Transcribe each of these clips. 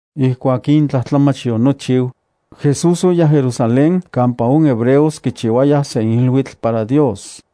Ijkuak in tlajtlamach yonochiu, Jesús oyaj Jerusalén kampa on hebreos kichiuayaj sen iluitl para Dios.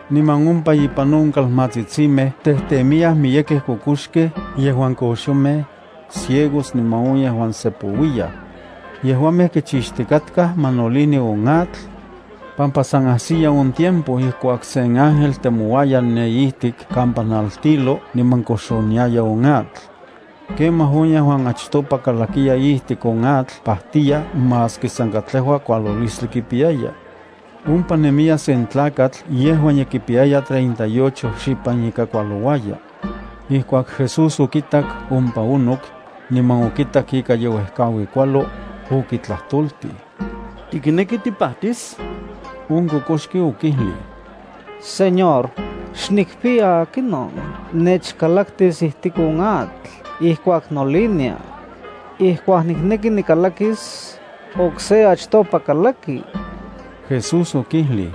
Niman ompa ipan on kalmatsitsimej tejtemiyaj miyekej kokoxkej yejuan koxomej, ciegos niman on yejuan sepouiyaj. Yejuamej kichixtikatkaj ma nolini on atl, pampa san ajsiya on tiempo ijkuak sen ángel temouaya ne ijtik kampa naltilo niman koxoniaya on atl. Kemaj on yejuan achtopa kalakiya ijtik on atl pajtiya maski san katlejua kualolistli kipiyaya. Ompa nemiya sen tlakatl yejuan ye kipiyaya treinta y ocho xipan ika kualouaya. Ijkuak Jesús okitak ompa onok, niman okitak ika ye uejkaui kualo, okitlajtoltij: —¿Tikneki tipajtis? On kokoxki okijlij: —Señor, xnikpiya akinon nechkalaktis ijtik on atl ijkuak nolinia. Ijkuak nikneki nikalakis, okse achtopa kalaki. Jesús okijlij: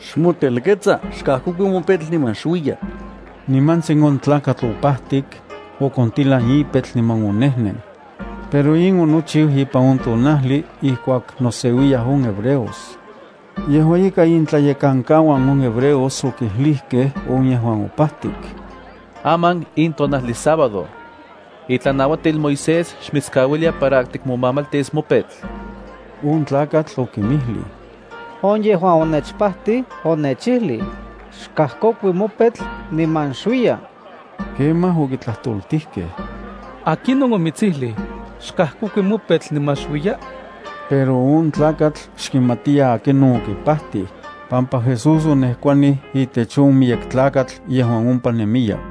—Xmotelketsa. Xkajkokui mopetl niman xuiya. Nimantsin on tlakatl opajtik, okontilan ipetl niman onejnen. Pero in onochiu ipan on tonajli ijkuak noseuiyaj on hebreos. Yejua ika intlayekankauan on hebreos okijlijkej on yejuan opajtik: —Aman in tonajli sábado. Itlanauatil Moisés xmitskauilia para tikmomamaltis mopetl. On tlakatl okinmijlij: —On yejuan onechpajtij onechijlij: “Xkajkokui mopetl niman xuiya.” Kemaj okitlajtoltijkej: —¿Akinon omitsijlij: “Xkajkokui mopetl niman xuiya”? Pero on tlakatl xkimatiya akinon okipajtij, pampa Jesús onejkuanij itech on miyek tlakatl yejuan ompa nemiya.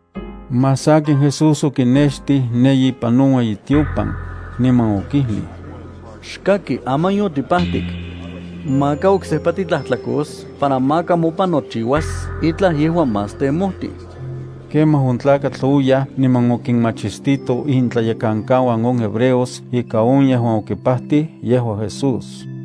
Más sakin Jesús okinextij ne ipan on ueyitiopan, niman okijlij: —Xkaki, aman yotipajtik. Maka oksejpa titlajtlakos para maka mopan nochiuas itlaj yejuan más temojtij. Kemaj on tlakatl oyaj niman okinmachistito intlayekankauan on hebreos ika on yejuan okipajtij yejua Jesús.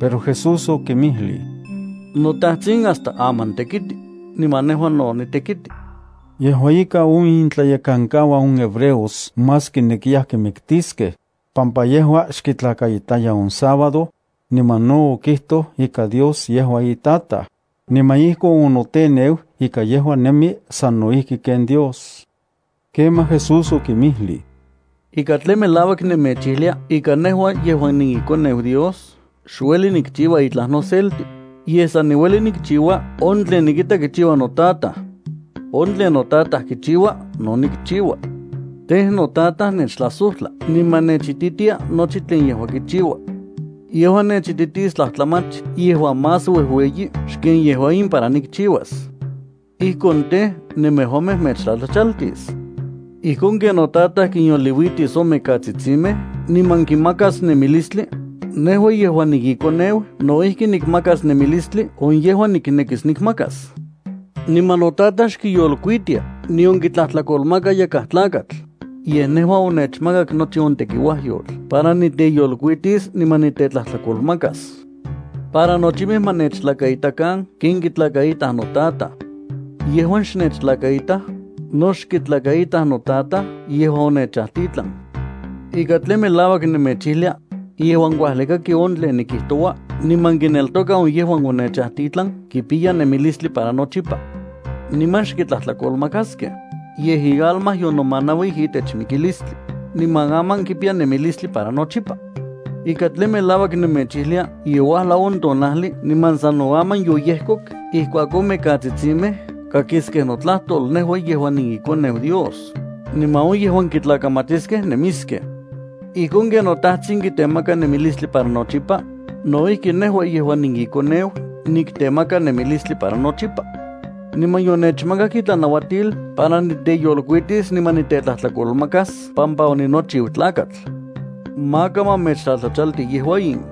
Pero Jesús okinmijlij: —NoTajtsin hasta aman tekiti, niman nejua no nitekiti. Yejua ika on intlayekankauan on hebreos más kinekiyaj kimiktiskej, pampa yejua xkitlakaitaya on sábado, niman no okijtoj ika Dios yejua iTataj, niman ijkon onoteneu ika yejua nemi sano ijki ken Dios. Kemaj Jesús okinmijlij: —Ika tlen melauak nemechijlia ika nejua yejuan niiKoneu Dios xueli nikchiua itlaj noselti, yej san niueli nikchiua on tlen nikita kichiua noTataj. On tlen noTataj kichiua no nikchiua. Tej, noTataj nechtlajsojtla niman nechititia nochi tlen yejua kichiua. Yejua nechititis tlajtlamach yejuan más uejueyi xken yejua in para nikchiuas. Ijkon tej, nemejuamej mechtlatlachaltis. Ijkon ken noTataj kinyoliuitis on mikatsitsimej niman kinmakas nemilistli, nejua yejuan niiKoneu no ijki nikmakas nemilistli on yejuan niknekis nikmakas. Niman noTataj xkiyolkuitia nion kitlajtlakolmaka yakaj tlakatl, yej nejua onechmakak nochi on tekiuajyotl para niteyolkuitis niman nitetlajtlakolmakas, para nochimej ma nechtlakaitakan ken kitlakaitaj noTataj. Yejuan xnechtlakaitaj, no xkitlakaitaj noTataj yejuan onechajtitlan. ’Ika tlen melauak nemechijlia: Yejuan kuajli kaki on tlen nikijtoua niman kineltoka on yejuan onechajtitlan kipiya nemilistli para nochipa. Niman xkitlajtlakolmakaskej, yej ialma yonomanauij itech mikilistli, niman aman kipiya nemilistli para nochipa. Ika tlen melauak nemechijlia ye uajlau on tonajli niman sano aman yoyejkok ijkuak on mikatsitsimej kakiskej notlajtol nejua yejuan niiKoneu Dios, niman on yejuan kitlakamatiskej nemiskej. Ijkon ken noTajtsin kitemaka nemilistli para nochipa, no ijki nejua yejuan niiKoneu niktemaka nemilistli para nochipa. Niman yonechmakak itlanauatil para niteyolkuitis niman nitetlajtlakolmakas pampa oninochiu Tlakatl. Maka ma mechtlatlachalti yejua in,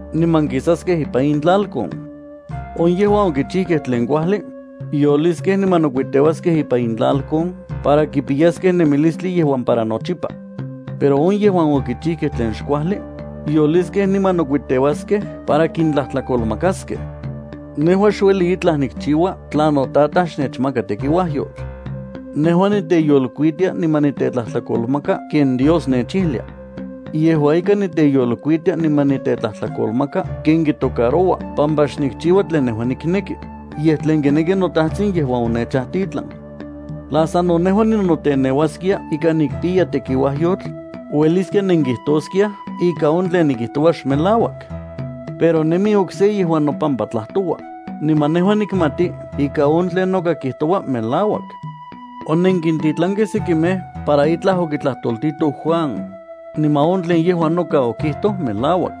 niman kisaskej ipan intlalkon. On yejuan okichijkej tlen kuajli, yoliskej niman nokuiteuaskej ipan intlalkon para kipiyaskej nemilistli yejuan para nochipa. Pero on yejuan okichijkej tlen xkuajli, yoliskej niman nokuiteuaskej para kintlajtlakolmakaskej. ’Nejua xueli itlaj nikchiua tla notataj xnechmaka tekiuajyotl. Nejua niteyolkuitia niman nitetlajtlakolmaka ken Dios nechijlia. Yejua ika niteyolkuitia niman nitetlajtlakolmaka ken kitocaroua pampa xnikchiua tlen nejua nikneki, yej tlen kineki noTajtsin yejuan onechajtitlan. Tla sano nejua ninoteneuaskia ika nikpiya tekiuajyotl, ueliskia nenkijtoskiaj ika on tlen nikijtoua xmelauak. Pero nemi okse yejuan nopama tlajtoua, niman nejua nikmati ika on tlen noka kijtoua melauak. Onenkintitlankej sekimej para itlaj okitlajtoltitoj Juan, niman on tlen yejua noka okijtoj melauak.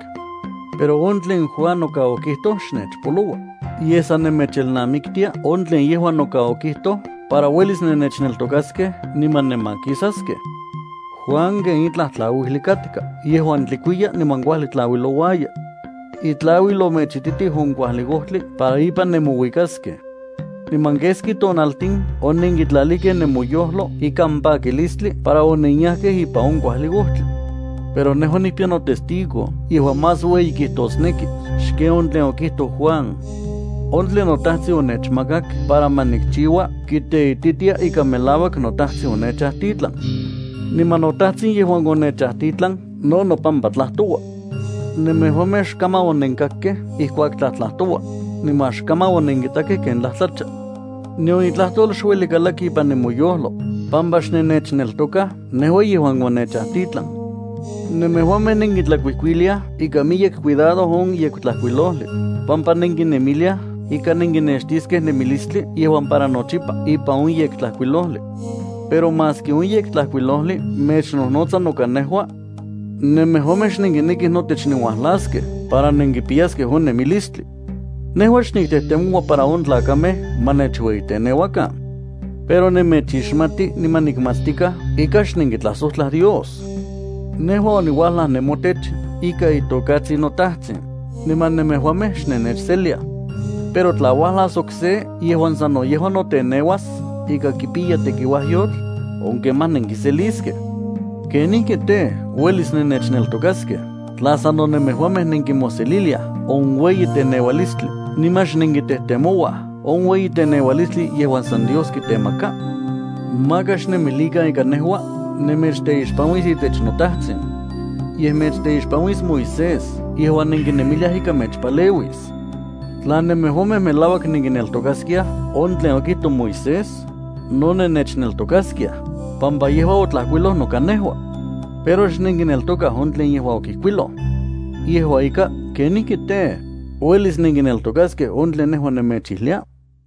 Pero on tlen Juan noka okijtoj xnechpoloua, yej san nemechelnamiktia on tlen yejua noka okijtoj para uelis nennechneltokaskej niman nenmakisaskej. Juan ken itlaj tlauijli katka yejuan tlikuiya niman kuajli tlauilouaya. Itlauil omechititij on kuajli ojtli para ipan nemouikaskej. Niman keski tonaltin onenkitlalijkej nemoyojlo ikan pakilistli para onenyajkej ipan on kuajli ojtli. Pero nejua nikpiya notestigo yejuan más ueyi kijtosneki xken on tlen okijtoj Juan. On tlen noTajtsin onechmakak para ma nikchiua kiteititia ika melauak noTajtsin onechajtitlan. Niman noTajtsin yejuan onechajtitlan no nopampa tlajtoua. Nemejuamej xkaman onenkakkej ijkuak tlajtlajtoua, niman xkaman onenkitakej ken tlajtlacha. Nion itlajtol xueli kalaki ipan nemoyojlo, pampa xnennechneltokaj nejua yejuan onechajtitlan. Nemejuamej nenkitlakuijkuiliaj ikan miyek cuidado on Yektlajkuilojli, pampa nenkinemiliaj ika nenkinextiskej nemilistli yejuan para nochipa ipan on Yektlajkuilojli. Pero maski on Yektlajkuilojli mechnojnotsa noka nejua, nemejuamej xnenkinekij notech nenuajlaskej para nenkipiyaskej on nemilistli. ’Nejua xniktejtemoua para on tlakamej ma nechueyiteneuakan. Pero nemechixmati niman nikmatstikaj ika xnenkitlajsojtla Dios. Nejua oniuajlaj nemotech ikan itokatsin noTajtsin, niman nemejuamej xnennechseliaj. Pero tla uajlas okse yejuan sano yejua teneuas ika kipiya tekiuajyotl, on kemaj nenkiseliskej. ¿Kenijki tej, uelis nennechneltokaskej tla sano nemejuamej nenkimoseliliaj on ueyiteneualistli niman xnenkitejtemouaj on ueyiteneualistli yejuan san Dios kitemaka? Maka xnemilikan ika nejua nemechteixpanuis itech noTajtsin. Yej mechteixpanuis Moisés yejuan nenkinemiliaj ika mechpaleuis. Tla nemejuamej melauak nenkineltokaskiaj on tlen okijtoj Moisés, no nennechneltokaskiaj, pampa yejua otlajkuiloj noka nejua. Pero xnenkineltokaj on tlen yejua okijkuiloj. Yejua ika, ¿kenijki tej, uelis nenkineltokaskej on tlen nejua nemechijlia?